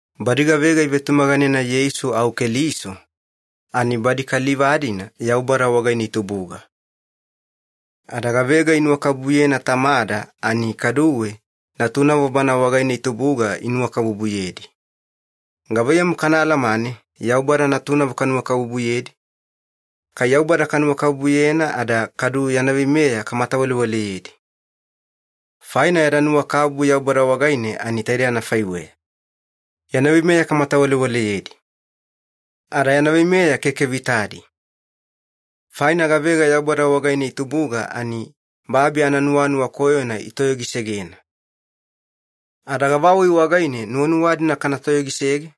Badi gavega ivetumaganena Yeisu au Keliso ani badi kaliva-dina Yaubada wagaine itubuga. Ada gavega inuwakabubuyena Tamada ani kaduwe natunavo Bana wagaine itubuga inuwakabubuyedi. Gavaiyamu kana alamane Yaubada natunavo kanuwakabubuyedi? Kai Yaubada kanuwakabubuyena ada kadu yana veimeya kamatawalewaleyedi. Faina yada nuwakabubu Yaubada wagaine ani taidei anafaiweya. Yana veimeya kamatawalewaleyedi. Ada yana veimeya keke vitadi. Faina gavega Yaubada wagaine itubuga ani babi ananuwanuwa koyona itoyogisegena. Ada gavawai wagaine nuwanuwa-dina kana toyogisege?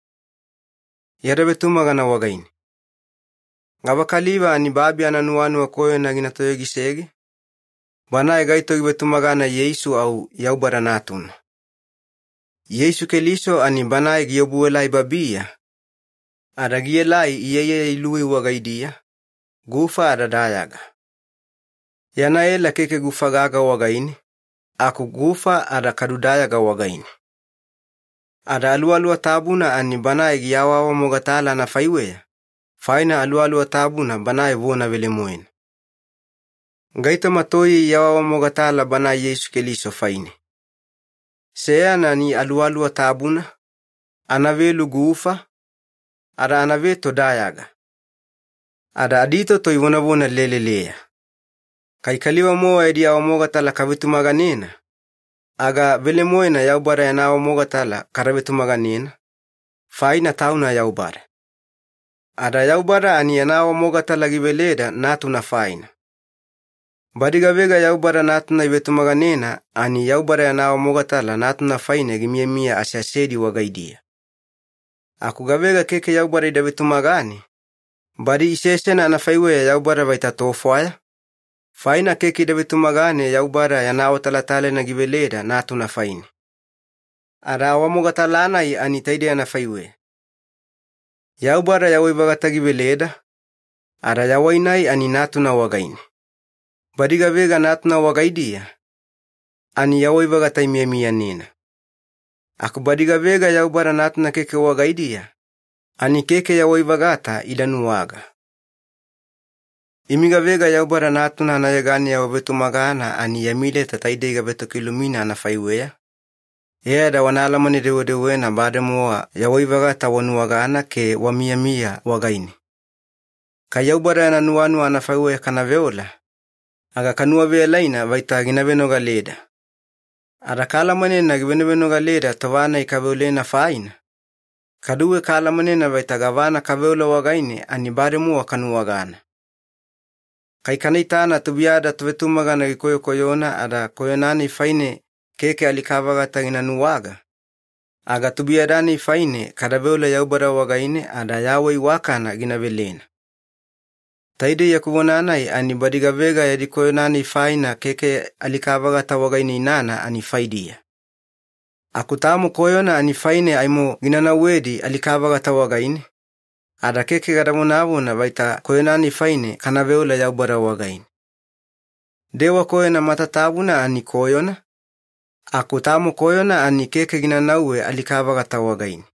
Yada vetumagana wagaine. Gavakaliva ani babi ananuwanuwa koyona gina toyogisege? Banae gaito givetumagana Yeisu au Yaubada Natuna. Yeisu Keliso ani Banae giobuelai babiya, ada gielai iyaiyaya iluwei wagaidiya, gufa ada dayaga. Yana ela keke gufa gaga wagaine, aku gufa ada kadu dayaga wagaine. Ada Aluwaluwa Tabuna ani Banae giawaawamogatala anafaiweya, faina Aluwaluwa Tabuna Banae vona velemoena. Gaitoma toiye iawaawamogatala Banae Yeisu Keliso faine. Seyana ani Aluwaluwa Tabuna, anavelu gufa, ada anaveto dayaga. Ada aditoto ivonavona leleleya. Kai kaliva-mowa yadi awamogatala kavetumaganena, aga velemoena Yaubada yana awamogatala kada vetumaganena, faina Tauna Yaubada. Ada Yaubada ani yana awamogatala giveleda Natuna faina. Badi gavega Yaubada Natuna ivetumaganena ani Yaubada yana awamogatala Natuna faine gimiyamiya aseasedi wagaidiya. Aku gavega keke Yaubada ida vetumagane, badi isesena anafaiweya Yaubada vaita tofwaya, faina keke ida vetumagane Yaubada yana awatalatalaina giveleda Natuna faine. Ada awamogatala-nai ani taidei anafaiweya. Yaubada yawai-vagata giveleda, ada yawai-nai ani Natuna wagaine. Badi gavega Natuna wagaidiya, ani yawai-vagata imiyamiyanena. Aku badi gavega Yaubada Natuna keke wagaidiya, ani keke yawai-vagata ida nuwaga. Imi gavega Yaubada Natuna anayeganeya wavetumagana ani yami leta taidei gavetokilumina anafaiweya, e ada wana alamane-dewedewena bademowa yawai-vagata wanuwagana ke wamiyamiya wagaine. Kai Yaubada yana nuwanuwa anafaiweya kana veola, aga kanuwaveyalaina vaita gina venogaleda. Ada kaalamanena givenovenogaleda tova-nai kaveolena faina, kaduwe kaalamanena vaita gavana kaveola wagaine ani bademowa kanuwagana. Kai kana itana tubuiyada tovetumagana gikoyokoyona ada koyona-nai faine keke alika-vagata gina nuwaga, aga tubuiyada-nai faine kada veola Yaubada wagaine ada yawai iwakana gina velena. Taidei yaku vona-nai ani badi gavega yadi koyona-nai faina keke alika-vagata wagaine inana ani faidiya. Aku tamo koyona ani faine aimo gina nauwedi alika-vagata wagaine, ada keke gada vonavona vaita koyona-nai faine kana veola Yaubada wagaine. Dewa koyona matatabuna ani koyona, aku tamo koyona ani keke gina nauwe alika-vagata wagaine.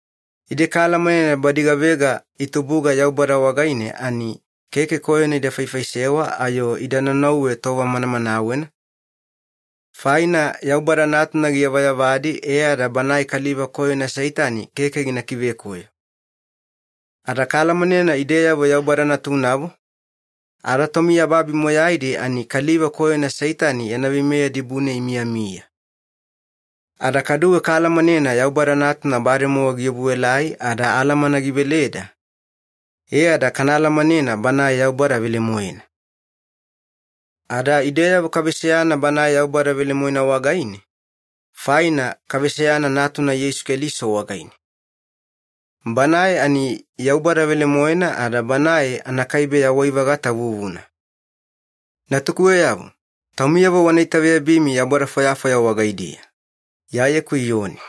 Ide kaalamanena badi gavega itubuga Yaubada wagaine ani keke koyona ida faifaisewa ayo ida naunauwe tova manamanawena, faina Yaubada Natuna giyavayavadi e ada banae kaliva koyona Seitani keke gina kivekoyo. Ada kaalamanena ideyavo Yaubada natunavo, ada tomiyababi moyaidi ani kaliva koyona Seitani yana veimeya dibune imiyamiya. Ada kaduwe kaalamanena Yaubada Natuna bademowa giobuelai ada alamana giveleda, e ada kana alamanena Banae Yaubada velemoena. Ada ideyavo kaveseyana Banae Yaubada velemoena wagaine, faina kaveseyana Natuna Yeisu Keliso wagaine. Banae ani Yaubada velemoena ada Banae anakaibe yawai-vagata vuvuna. Natukuweyavo, taumiyavo wana itaveyabimi yaubada fwayafwaya wagaidiya. Iyayeku Iyoni